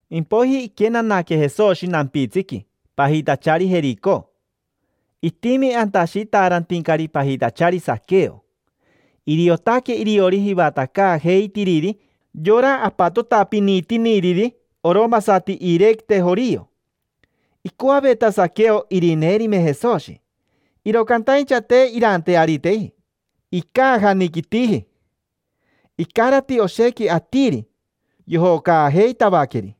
Impoiji iquenanaque Jesoshi nampitsiqui, pajitachari Jerico. Itimi anta ashitaarantincari pajitachari Saqueo. Iriotaque iriori jivatacaajeitiriri yora apatotapinitiniriri oromasati iirequite jorio. Icoaveta Saqueo irineerime Jesoshi, iro cantaincha te iranteariteji, icaajaniquitiji. Icarati oshequi atiri, yojocaajeitavaqueri.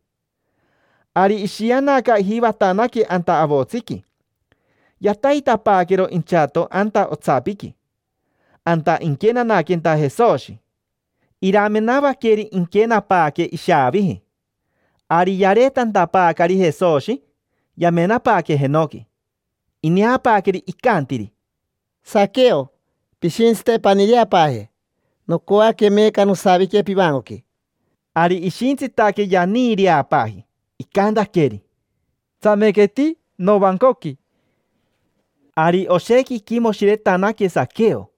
Ari ishianaca, ijivatanaque anta avotsiqui. Yataitapaaquero inchato anta otsapiqui, anta inquenanaquenta Jesoshi. Iramenavaqueri inquenapaaque ishaaviji. Ari yareetantapaacari Jesoshi, yamenapaaque jenoqui, ineapaaqueri, icantiri: —Saqueo, pishintsite paniireapaaje. Nocoaque meeca nosavique pivancoqui. Ari ishitsitaque yaniireapaaji, icantaqueri: —Tsamequeti novancoqui. Ari oshequi iquimoshiretanaque Saqueo,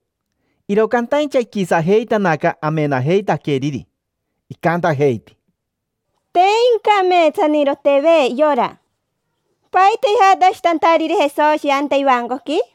iro cantaincha iquisajeitanaca amenajeitaqueriri. Icantajeiti: —Te incameetsanirotejive yora. ¿Paita ijatashitantariri Jesoshi anta ivancoqui?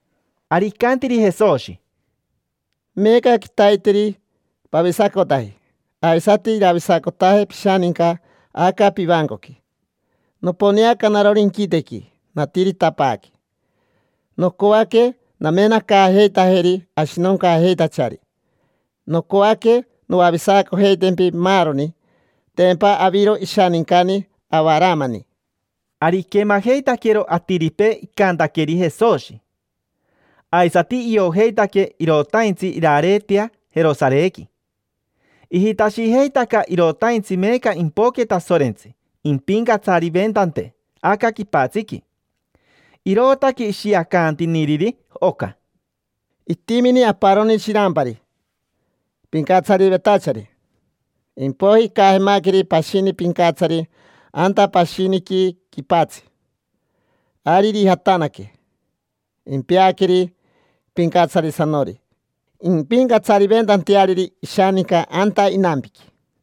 Ari icantiri Jesoshi: —Meeca quitaiteri pavisacotaji, aisati iravisacotaje pishaninca aca pivancoqui. Noponeaca narori inquitequi, natiritapaaque: nocoaque namenacaajeitajeri ashinoncaajeitachari, nocoaque noavisacojeitempi maaroni. Tempa aviro ishanincani Avaramani. Ari iquemajeitaquero atiripee icantaqueri Jesoshi. Aisati iojeitaque irotaintsi irareetea Jerosarequi. Ijitashijeitaca irotaintsi meeca impoque Tasorentsi impincatsariventante aca quipatsiqui, irootaque ishiacantiniriri oca: —Itimini aparoni shirampari, pincatsarivetachari. Impoiji icajemaqueri pashini pincatsari anta pashiniqui quipatsi. Ari irijatanaque, impeaqueri pincatsarisanori impincatsariventanteariri ishaninca anta inampiqui.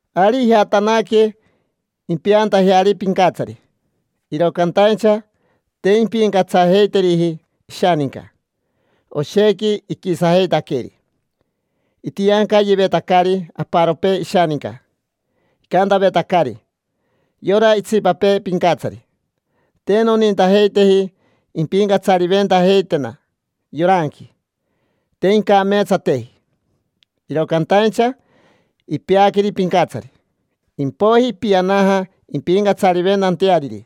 Ari ijatanaque impeantajeari pincatsari. Iro cantaincha te impincatsajeiteriji ishaninca, oshequi iquisajeitaqueri. Itiancayevetacari aparopee ishaninca, icantavetacari yora itsipapee pincatsari: “Te nonintajeiteji impincatsariventajeitena yoranqui, te incameetsateji”. Iro cantaincha ipeaqueri pincatsari, impoiji ipianaja impincatsariventanteariri.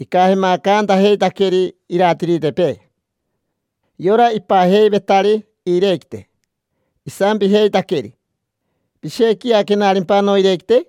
Icajemacantajeitaqueri iratiritepee: yora ipajeivetari iirequite. Isampijeitaqueri: “¿Pishequiaquenarimpa noirequite?”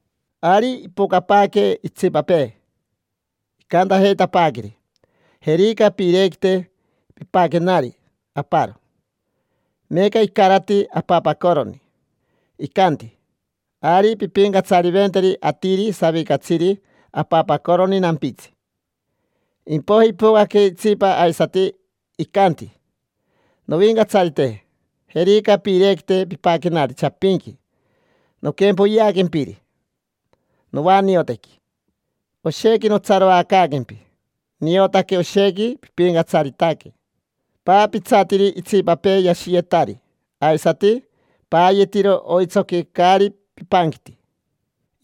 Ari ipocapaaque itsipapee, icantajeitapaaqueri: “Jerica piirequite. Pipaquenari aparo, meeca icarati apapacoroni”. Icanti: “Ari pimpincatsariventeri atiri savicatsiri apapacoroni nampitsi”. Impoiji ipocaque itsipa aisati, icanti: “Novincatsarite, jerica piirequite pipaquenari chapinqui. Noquempoyeaquempiri novaniotequi. Oshequi notsaroacaaquempi, niotaque oshequi pipincatsaritaque. Paapitsatiri itsipapee yashiyetari, aisati paayetiro oitsoqui caari pipanquiti”.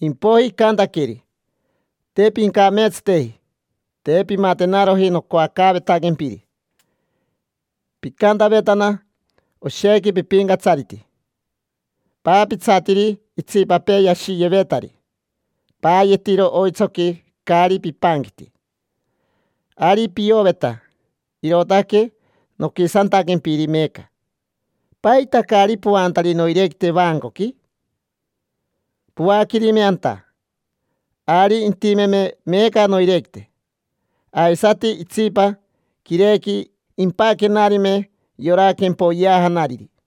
Impoiji icantaqueri: “Te pincameetsateji, te pimatenaroji nocoacaavetaquempiri. Picantavetana: ‘Oshequi pipincatsariti, paapitsatiri itsipapee yashiyevetari, paayetiro oitsoqui caari pipanquiti’. Ari pioveta, irootaque noquisantaquempiri meeca. ¿Paita caari poantari noirequite vaancoqui? Poaquerime anta, ari intimeme meeca noirequite, aisati itsipa quirequi impaquenarime yora quempoyeajanariri”.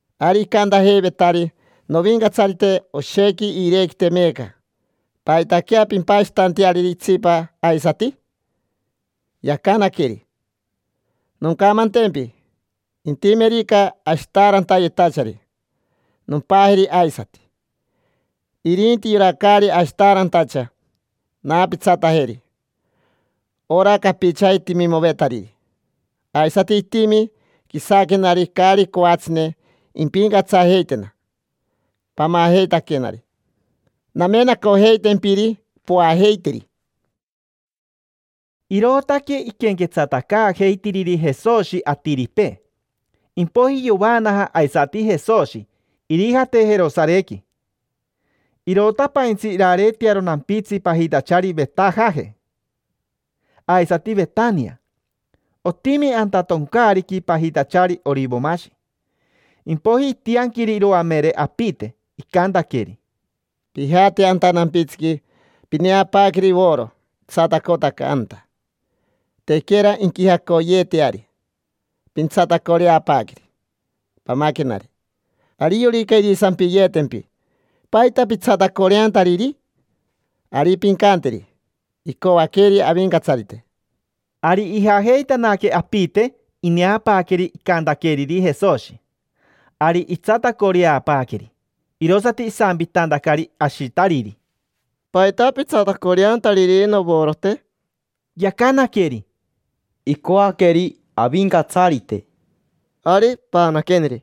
Ari icantajeivetari: “Novincatsarite, oshequi iirequite meeca. ¿Paitaquea pimpashitanteariri itsipa aisati?” Yacanaqueri: “Noncamantempi, intimerica ashitaarantayetachari, nompajeri aisati. Irinti yora caari ashitaarantacha, naapitsatajeri ora capichaji timimovetariri. Aisati itimi quisaquenari caari coatsine impincatsajeitena. Pamajeitaquenari, namenacojeitempiri poajeiteri”. Irootaque iquenquetsatacaajeitiriri Jesoshi atiripee. Impoiji yovaanaja aisati Jesoshi, irijate Jerosarequi. Irotapaintsi irareetearo nampitsi pajitachari Vetajaje aisati Vetania. Otimi anta toncaariqui pajitachari Orivomashi. Impoiji itianquiri iroamere apite, icantaqueri: —Pijate anta nampitsiqui, pineapaaqueri voro itsatacotaca anta. Tequera inquijacoyeeteari. Pintsatacoreapaaqueri, pamaquenari. Ariorica irisampiyeetempi: “¿Paita pitsatacoreantariri?” Ari pincanteri: “Icoaqueri Avincatsarite”. Ari ijajeitanaque apite, ineapaaqueri icantaqueriri Jesoshi. Ari itsatacoreapaaqueri. Irosati isampitantacari ashitariri: —¿Paita pitsatacoreantariri novorote? Yacanaqueri: —Icoaqueri Avincatsarite. —Ari, paanaqueneri.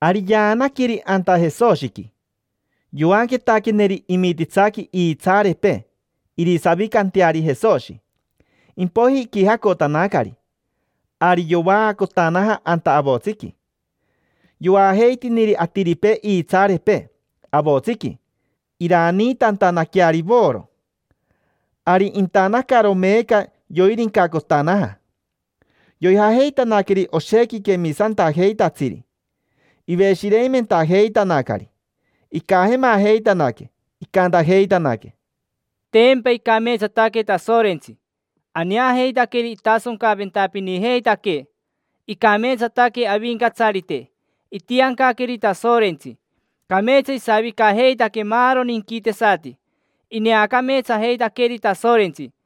Ari yaanaqueri anta Jesoshiqui. Yoanquetaqueneri imititsaqui iitsaarepee irisavicanteari Jesoshi, impoiji iquijacotanacari. Ari yovaacotanaja anta avotsiqui, yoajeitiniri atiripee iitsaarepee avotsiqui, iraniitantanaqueari voro. Ari intanacaro meeca yoirincacotanaja. Yoijajeitanaqueri oshequi quemisantajeitatsiri, iveshireimentajeitanacari, icajemajeitanaque. Icantajeitanaque: —Tempa icameetsataque Tasorentsi. Aneajeitaqueri itasoncaventapinijeitaquee. Icameetsataque Avincatsarite itiancaqueeri Tasorentsi. Cameetsa isavicajeitaque maaroni inquitesati, ineacameetsajeitaqueri Tasorentsi.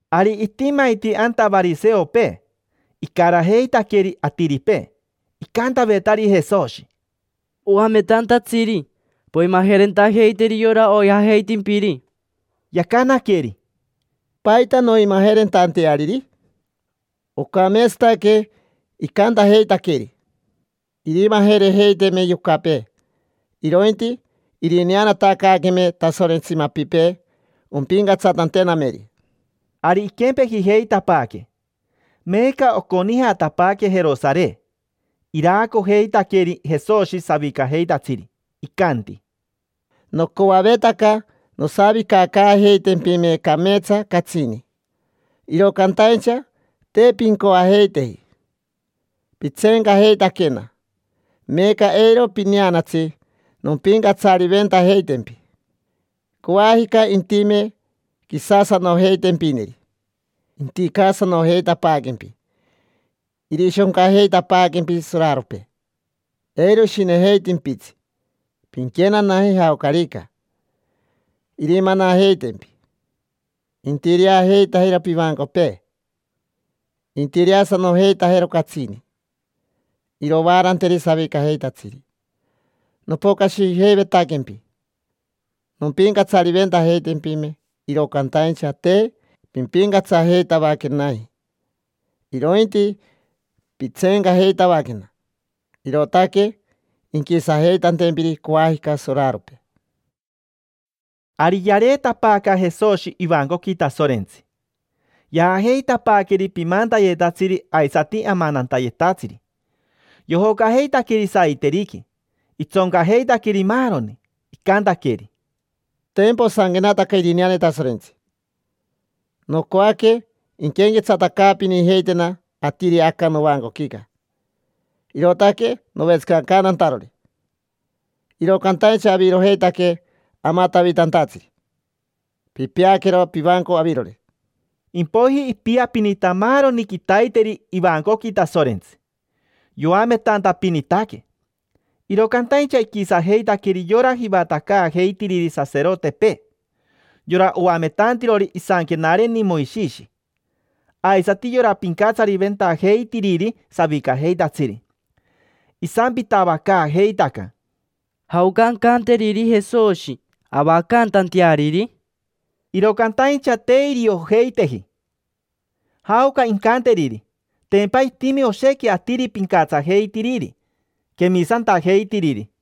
Ari itimaiti anta variseopee, icarajeitaqueri atiripee. Icantavetari Jesoshi: —Oametantatsiri, poimajerentajeiteri yora oijajeitimpiri. Yacanaqueri: —¿Paita noimajerentanteariri? Ocameetsataque icantajeitaqueri. Irimajerejeiteme yocapee, irointi irineanatacaaqueme Tasorentsi mapipee ompincatsatantenameri. Ari iquempejijeitapaaque, meeca oconijatapaaque Jerosare. Iraacojeitaqueri Jesoshi savicajeitatsiri, icanti: —Nocoavetaca nosavicacaajeitempime cameetsa catsini, iro cantaincha te pincoajeiteji. Pitseencajeitaquena, meeca eiro pineanatsi nompincatsariventajeitempi. Coajica intime quisasanojeitempineri, inticasanojeitapaaquempi, irishoncajeitapaaquempi soraropee, eiro ishinejeitimpitsi pinquenanaje jaocarica. Irimanajeitempi, intireajeitajero pivancopee, intireasanojeitajero catsini. Irovaaranteri savicajeitatsiri. Nopocashijeivetaquempi, nompincatsariventajeitempime, iro cantaincha te pimpincatsajeitavaquenaji, irointi pitseencajeitavaquena. Irootaque inquisajeitantempiri coajica soraropee. Ari yareetapaaca Jesoshi ivancoqui Tasorentsi, yaajeitapaaqueri pimantayetatsiri aisati amanantayetatsiri, yojocajeitaqueri saiteriqui. Itsoncajeitaqueri maaroni, icantaqueri: —Tempa osanquenataca irineane Tasorentsi: “Nocoaque inquenquetsatacaapinijeitena atiri aca novancoquica, irootaque novetsicacantantarori”. Iro cantaincha avirojeitaque amatavitantatsiri, pipeaquero pivanco avirori. Impoiji ipiapinita maaroni quitaiteri ivancoqui Tasorentsi, yoametantapinitaque. Iro cantaincha iquisajeitaqueri yora jivatacaajeitiriri saserotepee, yora oametantirori isanquenareni Moishishi, aisati yora pincatsariventajeitiriri savicajeitatsiri. Isampitavacaajeitaca: —¿Jaoca ancanteriri Jesoshi, avacantanteariri? Iro cantaincha te iriojeiteji jaoca incanteriri, tempa itimi oshequi atiri pincatsajeitiriri, quemisantajeitiriri.